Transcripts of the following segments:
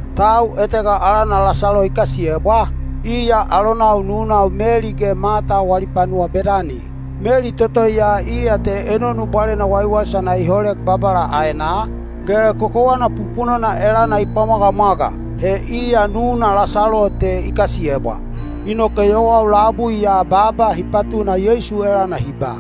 Tau etega alana Lasalo i kasiyebwa, iya alonau nunau Meli ge Mata wali panuwa Bedani. (Meli toto ya iya te enonu bwalena waiwaisana i holek Babala aenaa, ge kokowana pupunona elana i pwamwagamwaga. He iya nuna Lasalo te i kasiyebwa.) Inoke yowau labui ya baaba hi patuna Yeisu elana hi ba,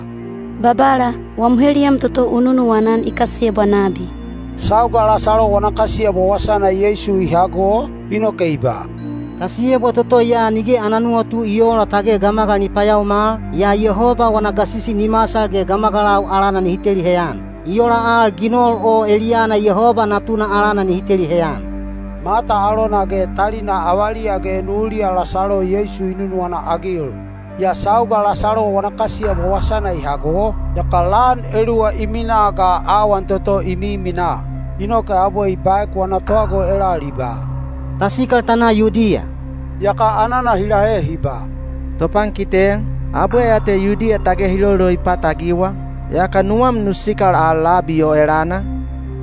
“Babala, wam heliyam toto u nunuwana-an i kasiyebwa nabi.” Sauga Lasalo wana kasiyebwa wasana Yeisu i hago, inoke i ba, “Kasiyebwa toto ya nige ana nuwatu i oola tage gamagal ni payaomal, yaa Yehoba wana gasisi ni masal ge gamagalau alana nihi teli heyan. I ola al ginol o eliyana Yehoba Natuna alana nihi teli heyan.” Mata alona ge talina avaliya ge nuliya Lasalo Yeisu i nunuwana-agil. Yaa sauga Lasalo wana kasiyebwa wasana i hago, yaka lan eluwa i minaa ga awan toto i miminaa. Inoke abwe i baek wana tohago elal i ba, “Ta sikal ta na Yudiya.” Yaka anana hi lahe hi ba, “Topankite, abwe ya te Yudiya tage hi loloipat-agiwa, yaka nuwam nu sikal al labi o elana?”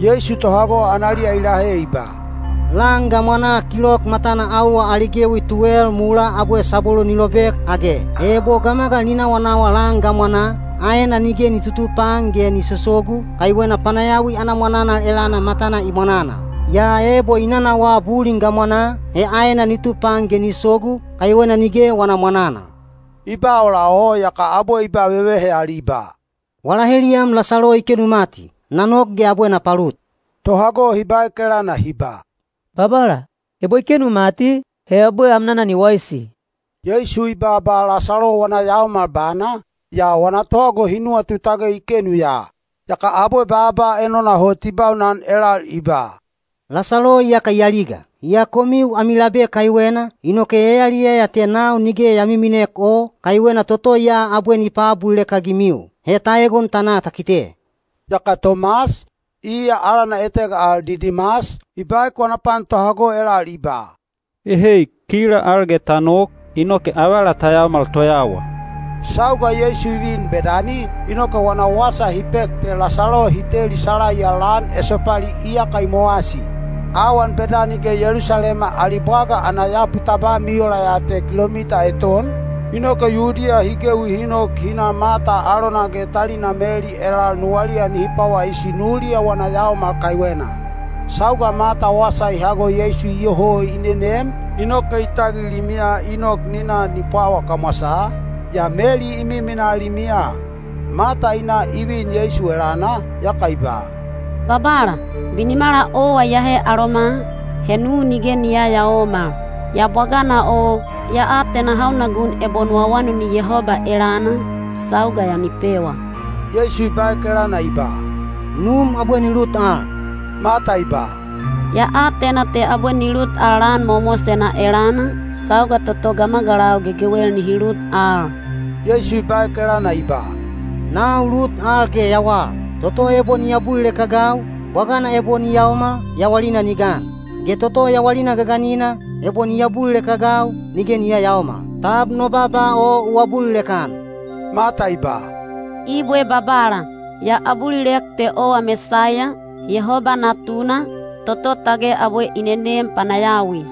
Yeisu tohago analiya i lahe i ba, “Lan gamwanaa kilok matana auwa ali gewi tuwel mulaa abwe sabwelu ni lobek, age? He ebo gamagal ni nawanawa lan gamwanaa, aena nige ni tutupaan ge ni sosogu, kaiwena panayawi ana mwananal elana matana i mwananal. Yaa ebo i nanawaa bulin gamwanaa, he aena ni tupaan ge ni sogu, kaiwena nige wana mwananal.” I ba ola o, yaka abwe i ba vevehe al i ba, “Wala heliyam Lasalo i kenu mati; na nok ge abwe na palut.” Tohago hi baek elana hi ba, “Babala, ebo i kenu mati, he abwe amnana ni waisi.” Yeisu i baaba Lasalo wana yaomal bana, yaa wana tohago hi nuwatu tage i kenu ya. Yaka abwe baaba enona hot i baunan elal i ba, “Lasalo iyaka i aliga. Yaa komiu ami labe kaiwena, inoke ya yaliyaya te nau nige ya miminek o, kaiwena toto ya abwe ni paabulilek-agimiu. He ta egon ta na ta kite.” Yaka Tomas, iya alana etega al Didimas, i baek wana pan tohago elal i ba, “Ehei, kila al ge ta nok, inoke avala ta yaomal toyawa.” Sauga Yeisu i vin Bedani, inoke wana wasa hi pek te Lasalo hi teli salaiya lan esopali iyaka i mowasi. Awan Bedani ge Yelusalema ali bwaga ana yapu tabam i ola ya te kilomita eton, inoke Yudiya hi gewi hi nok hi na Mata alona ge talina Meli elal nuwaliya nihi pwawaisi nuliya wana yaomal kaiwena. Sauga Mata wasa i hago Yeisu iyoho i nenem, inoke i tagil limiya i nok ni na ni pwawa kamwasaa, yaa Meli i miminaa limiya. Mata i na i vin Yeisu elana, yaka i ba, “Babala, binimala owa iyahe aloma, he nu nige ni yayaomal. Yaa bwagana o, ya atena hauna gun ebo nu awanuni Yehoba elana, sauga ya ni pewa.” Yeisu i baek elana i ba, “Num abwe ni lut al.” Mata i ba, “Ya atena te abwe ni lut al lan mowamowasena elana, sauga toto gamagalau gegewel nihi lut al.” Yeisu i baek elana i ba, “Nau lut al ge yawal. Toto ebo ni abulilek-agau, bwagana ebo ni yaomal, yawalina ni gan; ge toto yawalina gaganina, ebo ni abulilek-agau, nige ni yayaomal. Tab no baaba o u abulilek-an?” Mata i ba, “Ibwe Babala, ya abulilek te owa Mesaiya, Yehoba Natuna, toto tage abwe i nenem panayawi.”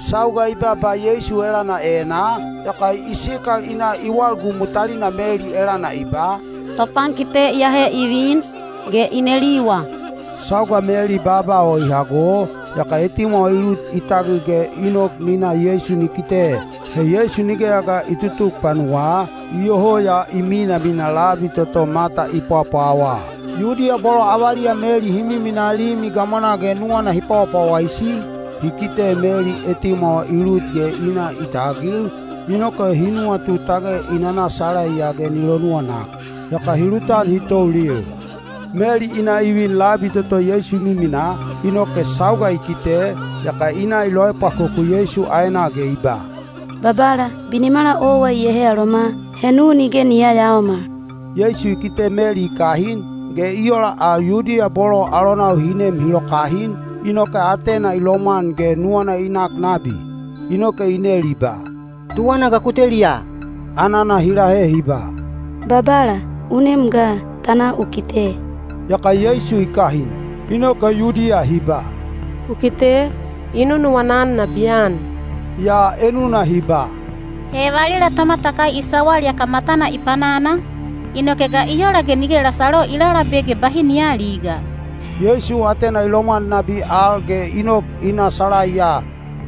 Sauga i baaba Yeisu elana enaa, yaka i sikal i na i walgumu talina Meli elana i ba, “Topankite iyahe i vin, ge i neliwa.” Sauga Meli baaba o i hago, yaka etimwawa i lut i tagil ge i nok ni na Yeisu ni kite. (He Yeisu nigeya ga i tutuk panuwaa, iyoho ya i minamina labi toto Mata i pwapwawaa.) Yudiya bolo avaliya Meli hi miminaa limi gamwanaa ge nuwana hi pwawapwawaisi, hi kite Meli etimwawa i lut ge i na i tagil, inoke hi nuwatu tage i nana salaiya ge ni lonuwanak. Yaka hi lutan hi toulil. Meli i na i vin labi toto Yeisu i miminaa, inoke sauga i kite, yaka i na i loepwakoku Yeisu aenaa ge i ba, “Babala, binimala owa iyahe aloma, he nu nige ni yayaomal.” Yeisu i kite Meli i kahin, ge i ola al Yudiya bolo alonau hi nem hi lokahin, inoke atena i lomwan ge nuwana i nak nabi. Inoke i nel i ba, “Tuwana ga ku teliya?” Anana hi lahe hi ba, “Babala, u nem ga, ta na u kite.” Yaka Yeisu i kahin. Inoke Yudiya hi ba, “Ku kite, i nunuwana-an nabiyan!” Yaa enuna hi ba, “He valila tomatakai i sawal yaka matana i panana, inoke ga i ola ge nige Lasalo i lalabe ge bahi ni aaliga?” Yeisu atena i lomwan nabi al ge i nok i na salaiya.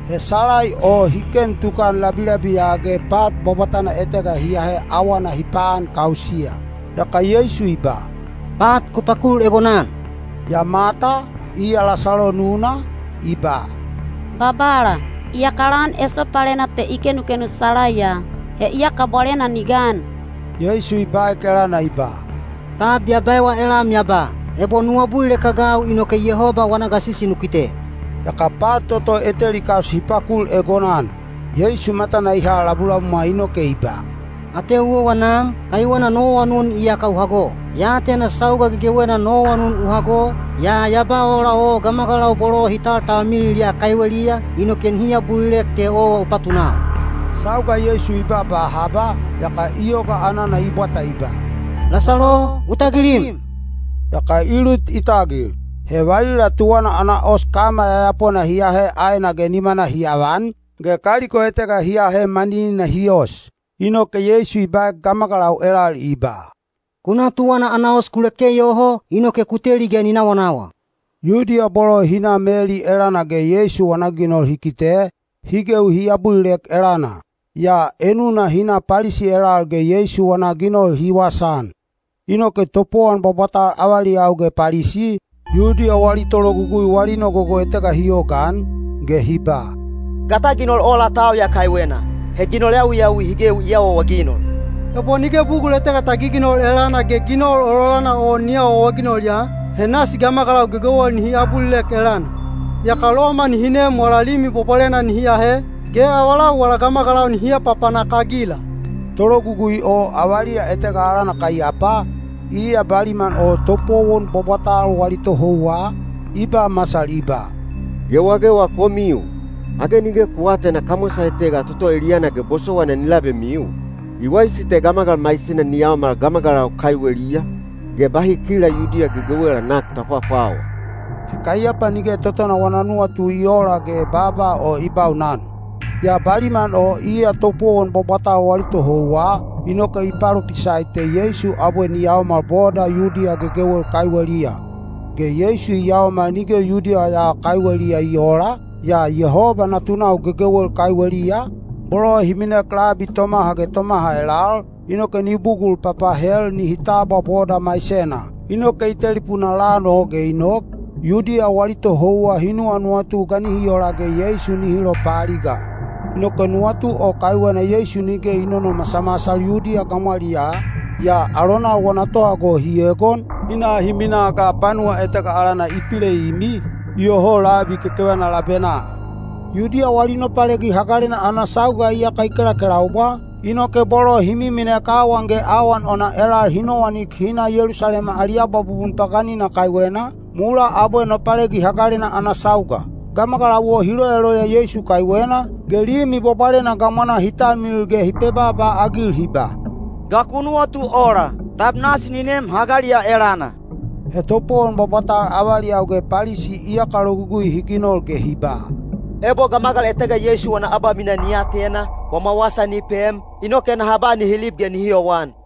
He salai o hi ken tukan labilabiya ge pat bwabwatana etega hi ahe awana hi paankausiya. Yaka Yeisu i ba, “Pat ku pakul egonan.” Yaa Mata, iya Lasalo nuna, i ba, “Babala, iyaka lan esopalena te i kenukenu salaiya. He iyaka bwalena ni gan!” Yeisu i baek elana i ba, “Tab ya baewa elam ya ba, ‘Ebo nu abulilek-agau inoke Yehoba wana gasisi nu kite’?” Yaka pat toto eteli kaus hi pakul egonan. Yeisu matana i ha labulabumwa inoke i ba, “Ateu owa Nam, kaiwena no awanun iyaka u hago. Ya atena sauga gegewena no awanun u hago, yaa ya ba ola o gamagalau bolo hi taltalmilil ya kaiweliya, inoke nihi abulilek te owa u patunau.” Sauga Yeisu i baaba haba, yaka i yoga anana i bwata i ba, “Lasalo, u tagilim!” Yaka i lut i tagil. He valila tuwana ana os kama yayapona hi ahe aena ge nimana hi avan, ge kaliko etega hi ahe maninina hi os. Inoke Yeisu i baek gamagalau elal i ba, “Ku na tuwana ana os ku leke yoho, inoke ku teli ge ni nawanawa.” Yudiya bolo hi na Meli elana ge Yeisu wana ginol hi kite, hi gewi hi abulilek elana. Yaa enuna hi na Palisi elal ge Yeisu wana ginol hi wasaan. Inoke topowon bwabwatal avaliyau ge Palisi, Yudiya wali tologugui wali nogogo etega hi yogaan, ge hi ba, “Ga ta ginol ola tau ya kaiwena? He ginol yawiyawi hi gewi i awaawaginol! Ebo nige bugul etega ta giginol elana ge ginol ololana o ni awaawaginol ya, he nasi gamagalau gegewel nihi abulilek elana. Yaka Loma nihi nem wala Limi Bwabwalena nihi ahe, ge avalau wala gamagalau nihi apapanak-agila.” Tologugui o avaliya etega alana Kaiyapa, iya baliman o topowon bwabwatal wali tohouwa, i ba masal i ba, “Gewagewa komiu! Age nige ku aatena kamwasa etega toto eliyana ge bosowaina ni labemiu? I waisi te gamagal maisena ni yaomal gamagalau kaiweliya, ge bahi kila Yudiya gegewela nak ta pwapwawa.” He Kaiyapa nige totona wana nuwatu i oola ge baaba o i baunan. Yaa baliman o iya topowon bwabwatal wali tohouwa, inoke i palopisai te Yeisu abwe ni yaomal boda Yudiya gegewel kaiweliya. Ge Yeisu i yaomal nige Yudiya ya kaiweliya i oola, yaa Yehoba natunau gegewel kaiweliya, bolo hi minek labi tomaha ge tomaha elal, inoke ni bugul papahel nihi tabwa boda maisena. Inoke i telipuna lan o ge i nok, Yudiya wali tohouwa hi nuwanuwatu ga nihi ola ge Yeisu nihi lopaaliga. Inoke nuwatu o kaiwena Yeisu nige i nonomasamasal Yudiya gamwaliyaa, yaa alonau wana tohago hi egon, hi na hi minaa ga panuwa etega alana Ipileimi, iyoho labi kekevana labenaa. Yudiya wali Nopalegi Hagalena ana sauga iyaka i kelakelaubwa, inoke bolo hi miminek awan ge awan ona elal hi nowanik hi na Yelusalema ali abwabubun paganina kaiwena, mulaa abwe Nopalegi Hagalena ana sauga. Gamagalau o hi loyaloya Yeisu kaiwena, ge Limi Bwabwalena gamwanaa hi talmilil ge hi pebaaba-agil hi ba, “Ga ku nuwatu ola? Tab nasi ni nem hagali ya elana?” He topowon bwabwatal avaliyau ge Palisi iyaka logugui hi ginol ge hi ba, “Ebo gamagal etega Yeisu wana abamina ni atena, wama wasa ni pem, inoke naha ba nihi lib ge nihi yowan.”